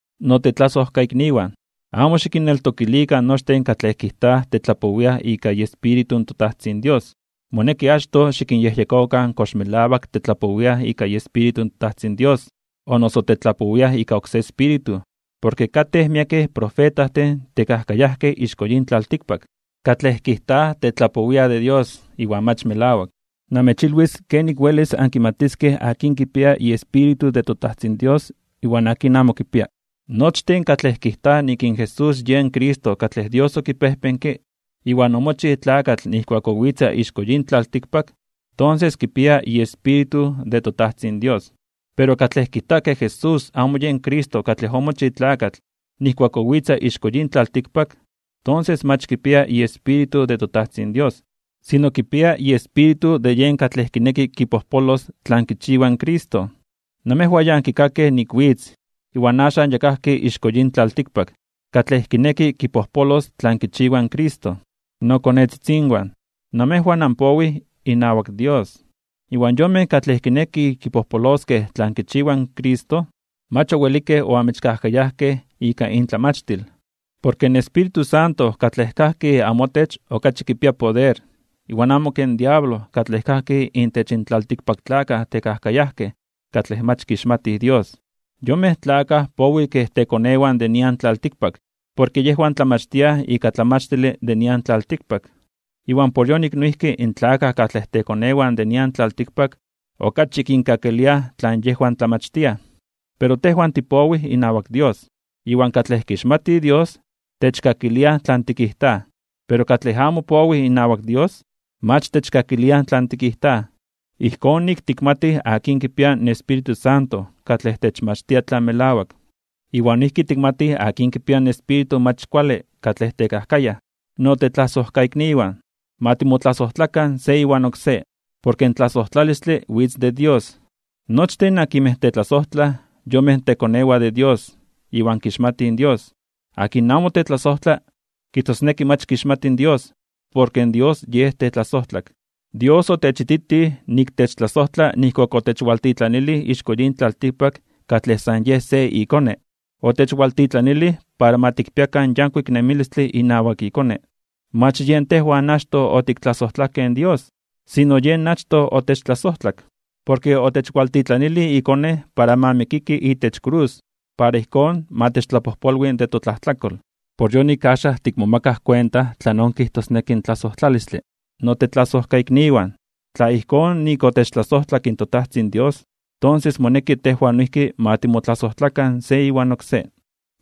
Notetlasojkaikniwan, amo xikinneltokilikan nochtin katlej kijtaj tetlapowiaj ika iEspíritu in toTajtzin Dios. Moneki achtoj xikinyejyekokan kox melawak tetlapowiaj ika iEspíritu de toTajtzin Dios o noso tetlapowiaj ika oksé espíritu. Porke katej miekej profetajtin tekajkayajkej ixko yin tlaltikpak, katlej kijtaj tetlapowiaj de Dios iwan mach melawak. Namechilwis kenik welis ankimatiskej akin kipia iEspíritu de toTajtzin Dios iwan akin amo kipia. Nochtin katlej kijtaj nik in Jesús yen Cristo katlej Dios okipejpenke, iwan omochij tlakatl nijkuak owitza ixko yin tlaltikpak, tonses kipia iEspíritu de toTajtzin Dios. Pero katlej kijta ke Jesús amo yen Cristo katlej omochij tlakatl nijkuak owitza ixko yin tlaltikpak, tonses mach kipia iEspíritu de toTajtzin Dios, sino kipia iespíritu de yen katlej kineki kipojpolos tlan kichiwa in Cristo. Namejwan ya ankikakej nik witz, iwan axan ya kajki ixko yin tlaltikpak katlej kineki kipojpolos tlan kichiwa in Cristo. Nokonetzitzinwan, namejwan anpowij inawak Dios, iwan yonmej katlej kinekij kipojpoloskej tlan kichiwa in Cristo mach owelikej oamechkajkayajkej ika intlamachtil. Porke in Espíritu Santo katlej kajki amotech okachi kipia poder iwan amo ken diablo katlej kajki intech in tlaltikpaktlakaj tekajkayajkej katlej mach kixmatij Dios. Yonmej tlakaj powij kej tekonewan de nian tlaltikpak porke yejwan tlamachtiaj ika tlamachtile de nian tlaltikpak, iwan por yonik noijki in tlakaj katlej tekonewan de nian tlaltikpak okachi kinkakiliaj tlan yejwan tlamachtiaj. Pero tejwan tipowij inawak Dios. Iwan katlej kixmati Dios, techkakilia tlan tikijtaj. Pero katlej amo powi inawak Dios, mach techkakilia tlan tikijtaj. Ijkón nik tikmatij akin kipia in Espíritu Santo katlej techmachtia tlan melawak, iwan noijki tikmatij akin kipia in espíritu mach kuale katlej tekajkayaj. Notetlasojkaikniwan, ma timotlasojtlakan se iwan oksé, porke in tlasojtlalistle witz de Dios. Nochtin akinmej tetlasojtlaj yonmej tekonewan de Dios iwan kixmatij Dios. Akin amo tetlasojtla, kijtosneki mach kixmati Dios, porke Dios Yej tetlasojtlak. Dios otechititij nik techtlasojtla nijkuak otechwaltitlanilij ixko yin tlaltikpak katlej san yej se iKone. Otechwaltitlanilij para ma tikpiakan yankuik nemilistle inawak iKone. Mach yen tejwan achtoj otiktlasojtlakej in Dios, sino Yen achtoj otechtlasojtlak. Porke otechwaltitlanilij iKone para ma mikiki itech krus para ijkón ma techtlapojpolwi de totlajtlakol. Por yonik axan tikmomakaj kuenta tlanon kijtosneki in tlasojtlalistle. Notetlasojkaikniwan, tla ijkón nik otechtlasojtlak toTajtzin Dios, tonses moneki tejwan noijki ma timotlasojtlakan se iwan oksé.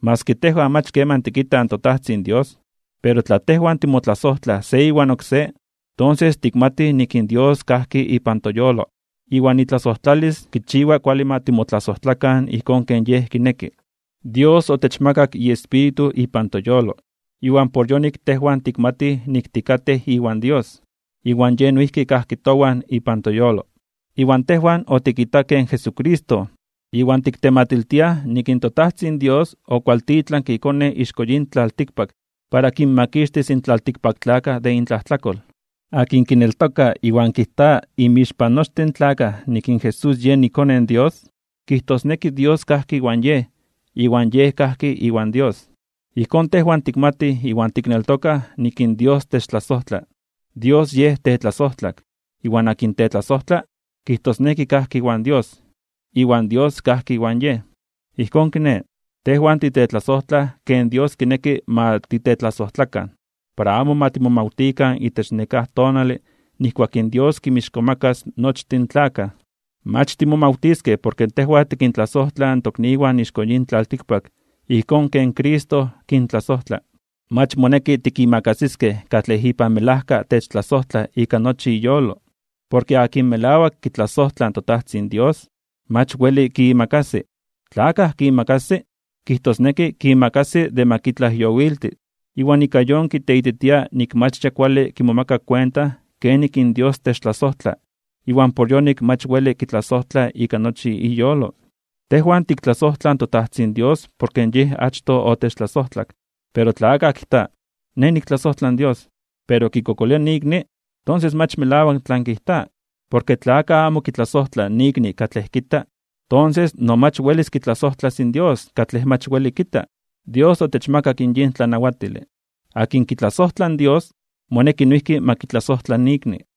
Maski tejwan mach keman tikitaj toTajtzin Dios, pero tla tejwan timotlasojtlaj se iwan oksé, tonses tikmatij nik in Dios kajki ipan toyolo, iwan itlasojtlalis kichiwa kuale ma timotlasojtlakan ijkón ken Yej kineki. Dios otechmakak iEspíritu ipan toyolo, iwan por yonik tejwan tikmatij nik tikatej iwan Dios, iwan Yej noijki kajki towan ipan toyolo. Iwan tejwan otikitakej in Jesucristo, iwan tiktematiltiaj nik in toTajtzin Dios okualtitlanke iKone ixko yin tlaltikpak para kinmakixtis in tlaltikpaktlakaj de intlajtlakol. Akin kineltoka iwan kijta inmixpan nochtin in tlakaj nik in Jesús yen iKone in Dios, kijtosneki Dios kajki iwan yej, iwan yej kajki iwan Dios. Ijkón tejwan tikmatij iwan tikneltokaj nik in Dios techtlasojtla. Dios Yej tetlasojtlak. Iwan akin tetlasojtla, kijtosneki kajki iwan Dios, iwan Dios kajki iwan yej. Ijkón kiné, tejwan titetlasojtlaj ken Dios kineki ma titetlasojtlakan, para amo ma timomawtikan itech nekáj tonale nijkuak in Dios kinmixkomakas (kintzonmanas) nochtin in tlakaj. Mach timomawtiskej porke tejwan tikintlasojtlaj in tokniwan ixko yin tlaltikpak ijkón ken Cristo kintlasojtla. Mach moneki tikimakasiskej katlej ipan melajka techtlasojtla ika nochi iyolo. Porke akin melawak kitlasojtla in toTajtzin Dios, mach weli kiimakasi. Tla akaj kiimakasi, kijtosneki kiimakasi de ma kitlajyowilti, iwan ika yon kiteititia nik mach ya kuale kimomaka kuenta kenik in Dios techtlasojtla iwan por yonik mach weli kitlasojtla ika nochi iyolo. Tejwan tiktlasojtlaj in toTajtzin Dios porke Yej achtoj otechtlasojtlak. Pero tla akaj kijta: “Nej niktlasojtla in Dios”, pero kikokolia ikni, tonses mach melawak tlan kijta. Porke tla akaj amo kitlasojtla ikni katlej kita, tonses no mach welis kitlasojtlas in Dios katlej mach weli kita. Dios otechmakak yin tlanawatile: akin kitlasojtla in Dios moneki noijki ma kitlasojtla ikni.